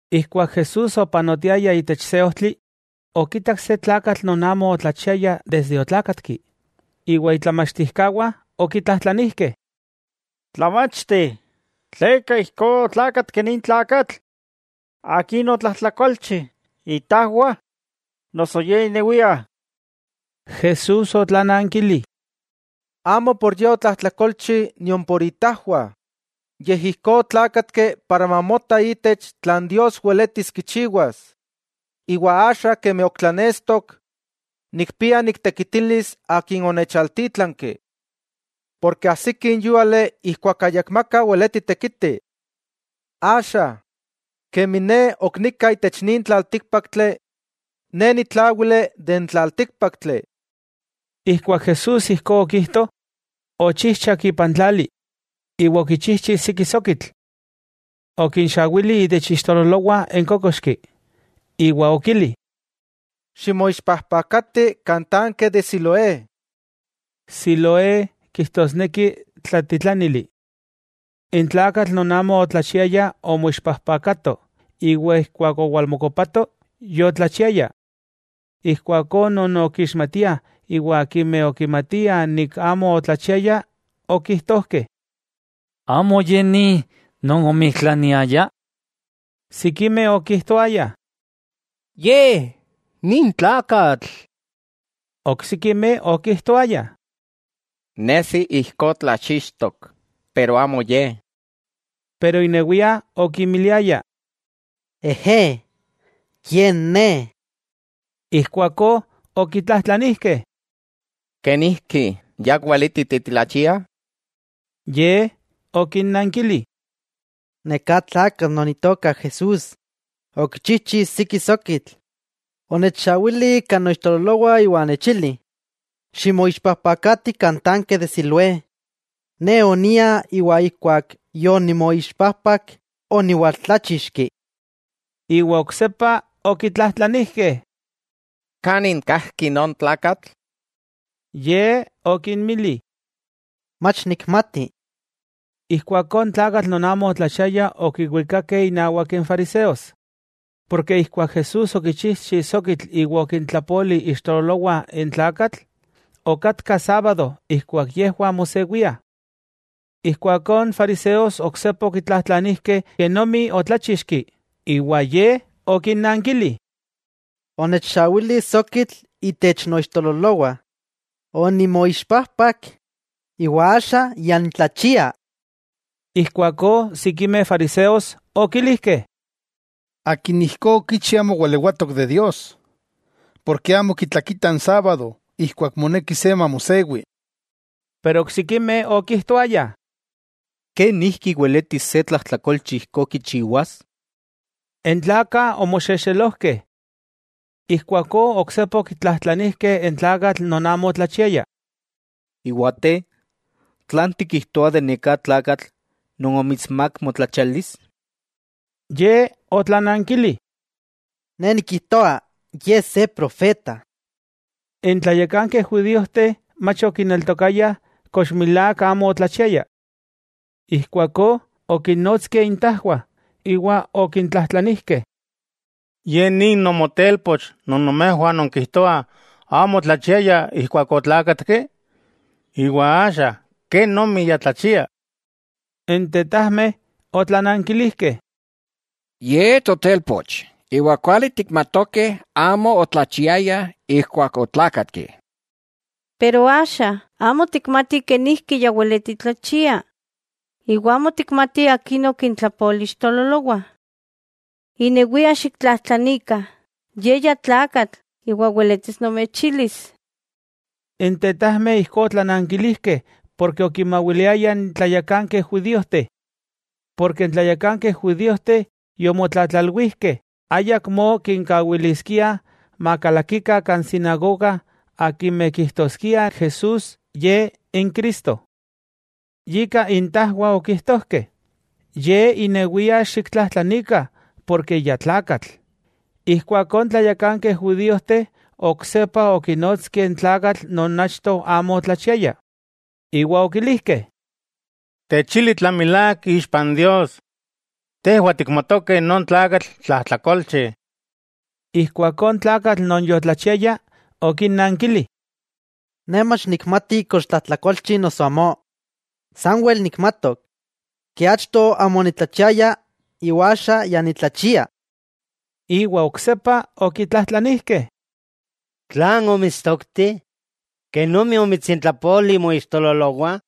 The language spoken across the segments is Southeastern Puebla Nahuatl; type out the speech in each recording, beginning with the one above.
Ijkuak Jesús opanotiaya itech se ojtli, okitak se tlakatl non amo otlachiaya desde otlákatki. Iwa itlamachtijkawah okitlajtlanijkeh: —Tlamachti, ¿tleka ijkó otlákatki nin tlakatl? ¿Akin otlajtlakolchi, itajwah, noso ye inewia? Jesús otlanankili: —Amo por ye otlajtlakolchi nion por itajwah, yej ijkó otlákatki para mamota ítech, tlan Dios weletis kichiwas. Iwa axa kemi ok tlanestok, nikpia niktekitilis Akin onechaltítlanki, porke ajsiki n yúali ijkuak ayakmaka weleti tekiti. Axa, kemi Ne ok nika itech nin tlaltíkpaktli, Ne nitláwili itech n tlaltíkpaktli. Ijkuak Jesús ijkó okijto, ochijchak ipan tlali, iwa okichijchi siki sokitl. Okinxawili itech ixtololowah n kókoxki, iwa okili: —Ximoixpajpakati kan tanke de Siloé. Siloé kijtosneki Tlatitlánili. N tlakatl non amo otlachiaya omoixpajpakato, iwa ijkuak owalmokopato, yotlachiaya. Ijkuakó non okixmatiah iwa akimeh okimatiah amo otlachiaya okijtojkeh: —¿Amo ye ni non omijtlaniaya? Sikimeh okijtoayah: —Ye ni n tlakatl. Oksikimeh okijtoayah: —Nesi ijkó tlachixtok, pero amo ye. Pero inewia okimiliaya: —Ejé, ye ne. Ijkuakó okitlajtlanijkeh: —¿Kenijki ya weleti titlachia? Ye okinnankili: —Neká tlakatl non Itoka Jesús, okichijchi siki sokitl, onechxawili kan noixtololowah iwa onechili: “Ximoixpajpakati kan tanke de Siloé.” Ne onia iwa ijkuak yonimoixpajpak, oniwaltláchixki. Iwa oksepa okitlajtlanijkeh: —¿Kanin kajki non tlakatl? Ye okinmili: —Mach nikmati. Ijkuakó n tlakatl non amo otlachiaya okiwikakeh innawak n fariseos. Porke ijkuak Jesús okichijchi sokitl iwa okintlapoli ixtololowah n tlakatl, okatka sábado ijkuak yejwah mosewiah. Ijkuakó n fariseos oksepa okitlajtlanijkeh kenomi otláchixki, iwa ye okinnankili: —Onechxawili sokitl itech noixtololowah, onimoixpajpak, iwa axa ya nitlachia. Ijkuakó sikimeh fariseos okilijkeh: —Akin ijkó okichi amo walewatok de Dios, porke amo kitlakita n sábado ijkuak moneki se mamosewi. Pero oksikimeh okijtoayah: —¿Kenijki weletis se tlajtlakolchi ijkó kichiwas? N tlakah omoxexelojkeh. Ijkuakó oksepa okitlajtlanijkeh n tlakatl non amo otlachiaya: —¿Iwa te, tlan tikijtoa de neká tlakatl non omitsmák motlachialis? Ye otlanankili: —Ne nikijtoa Ye se profeta. N tlayakankeh judíojteh mach okineltokayah kox milák amo otlachiaya. Ijkuakó okinnotskeh intajwah, iwa okintlajtlanijkeh: —¿Ye ni nomotelpoch non nomejwah nonkijtoah amo otlachiaya ijkuak otlákatki? ¿Iwa axa kenomi ya tlachia? N tetajmeh otlanankilijkeh: —Ye totelpoch, iwa kuali tikmatokeh amo otlachiaya ijkuak otlákatki. Pero axa, amo tikmatih kenijki ya weleti tlachia iwa amo tikmati akin okintlapoli ixtololowah. Inewia xiktlajtlanikah, ye ya tlakatl iwa weletis nomechilis. N tetajmeh ijkó otlanankilijkeh porke okinmawiliayah n tlayakankeh judíojteh. Porke n tlayakankeh judíojteh yomotlatlalwijkeh ayakmó kinkawiliskiah makalakikah kan sinagoga akimeh kijtoskiah Jesús Ye n Cristo. Yika itajwah okijtojkeh: “Ye inewia xiktlajtlanikah porke ya tlakatl.” Ijkuakó n tlayakankeh judíojteh oksepa okinotskeh n tlakatl non achto amo otlachiaya, iwa okilijkeh: —Techili tlan milák ixpa n Dios, tejwah tikmatokeh non tlakatl, tlajtlakolchi. Ijkuakó n tlakatl non yotlachiaya okinnankili: —Ne mach nikmati kox tlajtlakolchi noso amó. Sanwel nikmatok, achto amo onitlachiaya iwa axa ya nitlachia. Iwa oksepa okitlajtlanijkeh: —¿Tlan omitstokti? ¿Kenomi omitsintlapoli moixtololowah?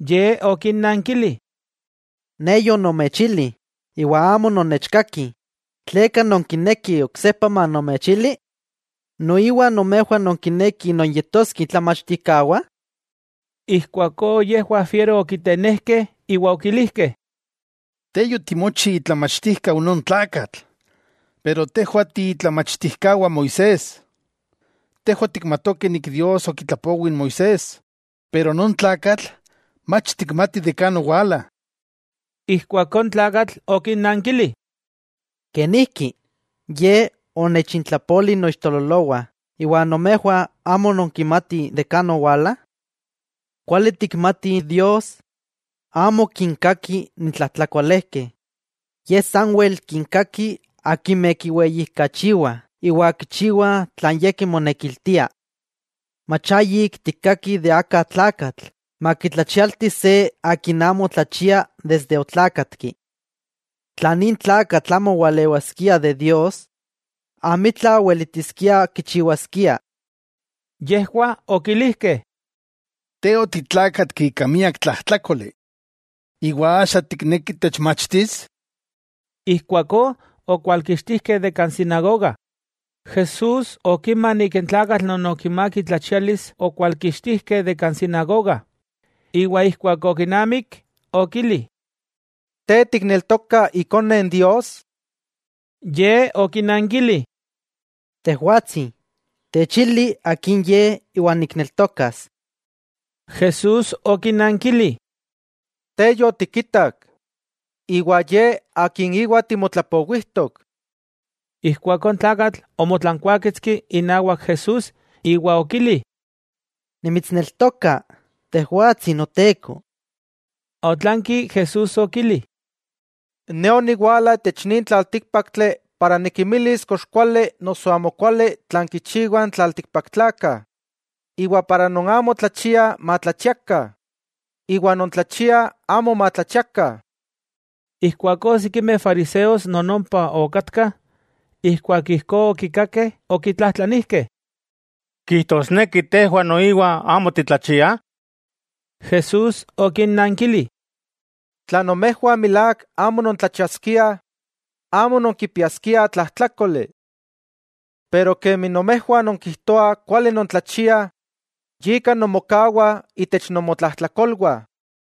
Ye okinnankili: —Ne yonomechili iwa amo nonnechkakih, ¿tleka nonkinekih oksepa manomechili? ¿Noiwa nomejwah nonkinekih nonyetoskeh itlamachtijkawah? Ijkuakó yejwah fiero okitenejkeh iwa okilijkeh: —Te yotimochi itlamachtijkau non tlakatl, pero tejwah tiitlamachtijkawah Moisés. Tejwah tikmatokeh Dios okitlapowi n Moisés. Pero non tlakatl, mach tikmatih kan owala. Ijkuakó n tlakatl okinnankili: —¡Kenijki! Ye onechintlapoli noixtololowah iwa nomejwah amo nonkimatih kan owala. Kuali tikmatih Dios amo kinkaki n tlajtlakolejkeh. Ye sanwel kinkaki akimeh kiweyijkachiwah iwa kichiwah tlan Ye kimonekiltia. Mach ayik tikkakih aka tlakatl makitlachialti se akin amo tlachia desde otlákatki. Tla nin tlakatl amo walewaskia de Dios, amitla weletiskia kichiwaskia. Yejwah okilijkeh: —Te otitlákatki ika miak tlajtlákoli, ¿iwa axa tikneki techmachtis? Ijkuakó okwalkixtijkeh de kan sinagoga. Jesús okima n tlakatl non okimák itlachialis okwalkixtijkeh de kan sinagoga, iwa ijkuak okinamik okili: —¿Te tikneltoka Ikone Dios? Ye okinankili: —Tejwatsi, techili akin ye iwa nikneltokas. Jesús okinankili: —Te yotikitak, iwa Ye Akin íwa timotlapowijtok. Ijkuakó n tlakatl omotlankuáketski inawak Jesús iwa okili: —Nimitsneltoka, Tejwatsi Noteko. Otlanki Jesús okili: —Ne oniwala itech nin tlaltíkpaktli para nikinmilis kox kuali noso amokuali tlan kichiwah n tlaltikpaktlakah, iwa non amo tlachiah matlachiakah iwa non tlachiah amo matlachiakah. Ijkuakó sikimeh fariseos non ompa okatkah, ijkuak ijkó okikakeh okitlajtlanijkeh: —¿Kijtosneki tejwah noiwa amo titlachiah? Jesús okinnankili: —Tla nomejwah milák amo nontlachiaskiah, amo nonkipiaskiah tlajtlákoli. Pero kemi nomejwah nonkijtoah kuali nontlachiah, yika nonmokawah itech nomotlajtlakolwah.